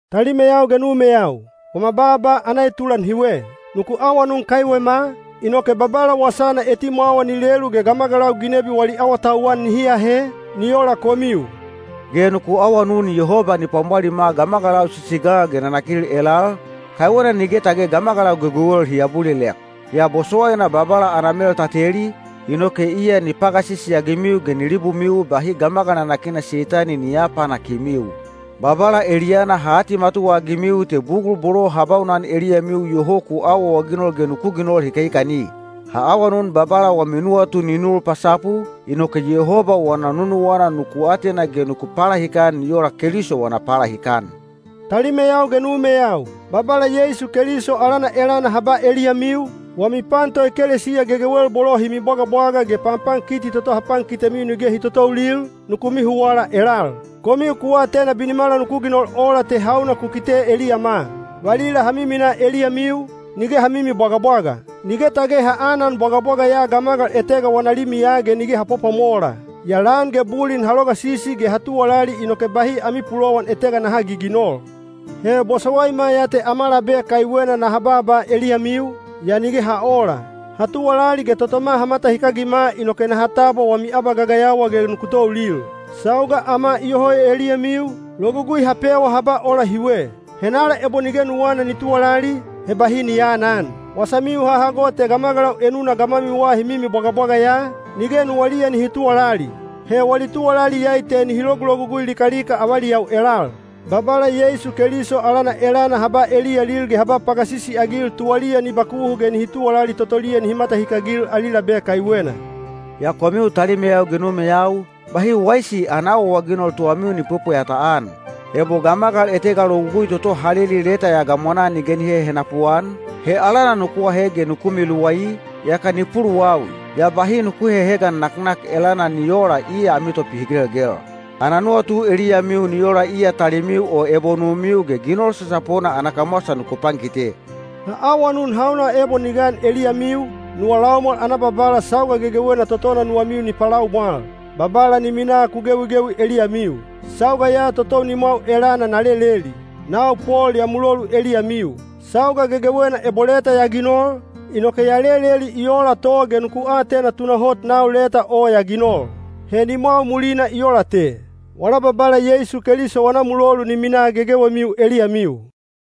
Talimeyau ge numeyau, wama baaba ana etulan hiwe. Nuku awanun kaiwema, inoke Babala wasana etimwawa ni lelu ge gamagalau ginebi wali awatauwan nihi ahe, ni ola komiu. Ge nuku awanun Yehoba ni pwamwalima gamagalau sisigal ge nanakil elal, kaiwena nige tage gamagalau gegewel hi abulilek. Yaa bosowaina Babala ana mel ta teli, inoke iya ni pagasisi-agimiu ge ni libumiu bahi gamagal nanakina Seitani ni aapanakimiu. Babala eliyana ha atimatuwa-agimiu te bugul bolo ha baunan eliyamiu iyoho ku awaawaginol ge nuku ginol hikahikani. Ha awanun Babala wami nuwatu ni nul pasapu, inoke Yehoba wana nunuwana nuku atena ge nuku palahikan ni ola Keliso wana palahikan. Talimeyau ge numeyau, Babala Yeisu Keliso alana elana ha ba eliyamiu, wami pan toekelesiya gegewel bolo hi mibwagabwaga ge panpankiti toto ha pankitemiu nige hi totoulil, nuku mihuwala elal. Komiu ku atena binimala nuku ginol ola te hauna ku kite eliyama. Valila ha miminaa eliyamiu, nige ha mimibwagabwaga. Nige tage ha anan bwagabwaga ya gamagal etega wana limiya ge nige ha pwapwamola. Yaa lan ge bulin ha logasisi ge ha tuwalali inoke bahi ami pulowan etega naha giginol. He bosowaima ya te ama labe kaiwena ge naha baaba eliyamiu, yaa nige ha oola. Ha tuwalali ge totoma ha matahikagima inoke naha tabwa wami abagagayawa ge nuku toulil. Sauga ama iyoho eliyamiu, logugui ha pewa ha ba ola hiwe: “Henala ebo nige nuwana ni tuwalali, he bahi ni aanan.” Wasamiu ha hago te gamagalau enuna gamwamiwa hi mimibwagabwaga ya, nige nuwaliya nihi tuwalali. He wali tuwalali iyai te nihi logulogugui likalika avaliyau elal. Babala Yeisu Keliso alana elana ha ba eliyalil ge ha ba pagasisi-agil tuwaliya ni bakuhu ge nihi tuwalali totoliya nihi matahikagil ali labe kaiwena. Yaa komiu talimeyau ge numeyau, bahi waisi ana awaawaginol tuwamiu ni pwepweyata-an. Ebo gamagal etega logugui toto ha leli leta ya gamwanaa nige ni hehenapu-an, he alana nuku ahe ge nuku miluwai, yaka ni puluwawi. Yaa bahi nuku hehegan naknak elana ni oola iya ami topihigelgel. Ana nuwatu eliyamiu ni ola iya talimiu o ebo numiu ge ginol sasapona ana kamwasa nuku pankite. Ha awanun hauna gun ebo ni gan eliyamiu, nuwa laumwal ana Babala sauga gegewena totona nuwamiu ni palaumwal. Babala ni minaa ku gewigewi eliyamiu. Sauga ya totou nimwau elana na leleli. Nau Pol ya mulolu eliyamiu. Sauga gegewena ebo leta ya ginol, inoke ya leleli i oola to ge nuku atena tunahot nau leta o ya ginol. He nimwau mulina i oola te. Wala Babala Yeisu Keliso wana mulolu ni minaa gegewemiu eliyamiu.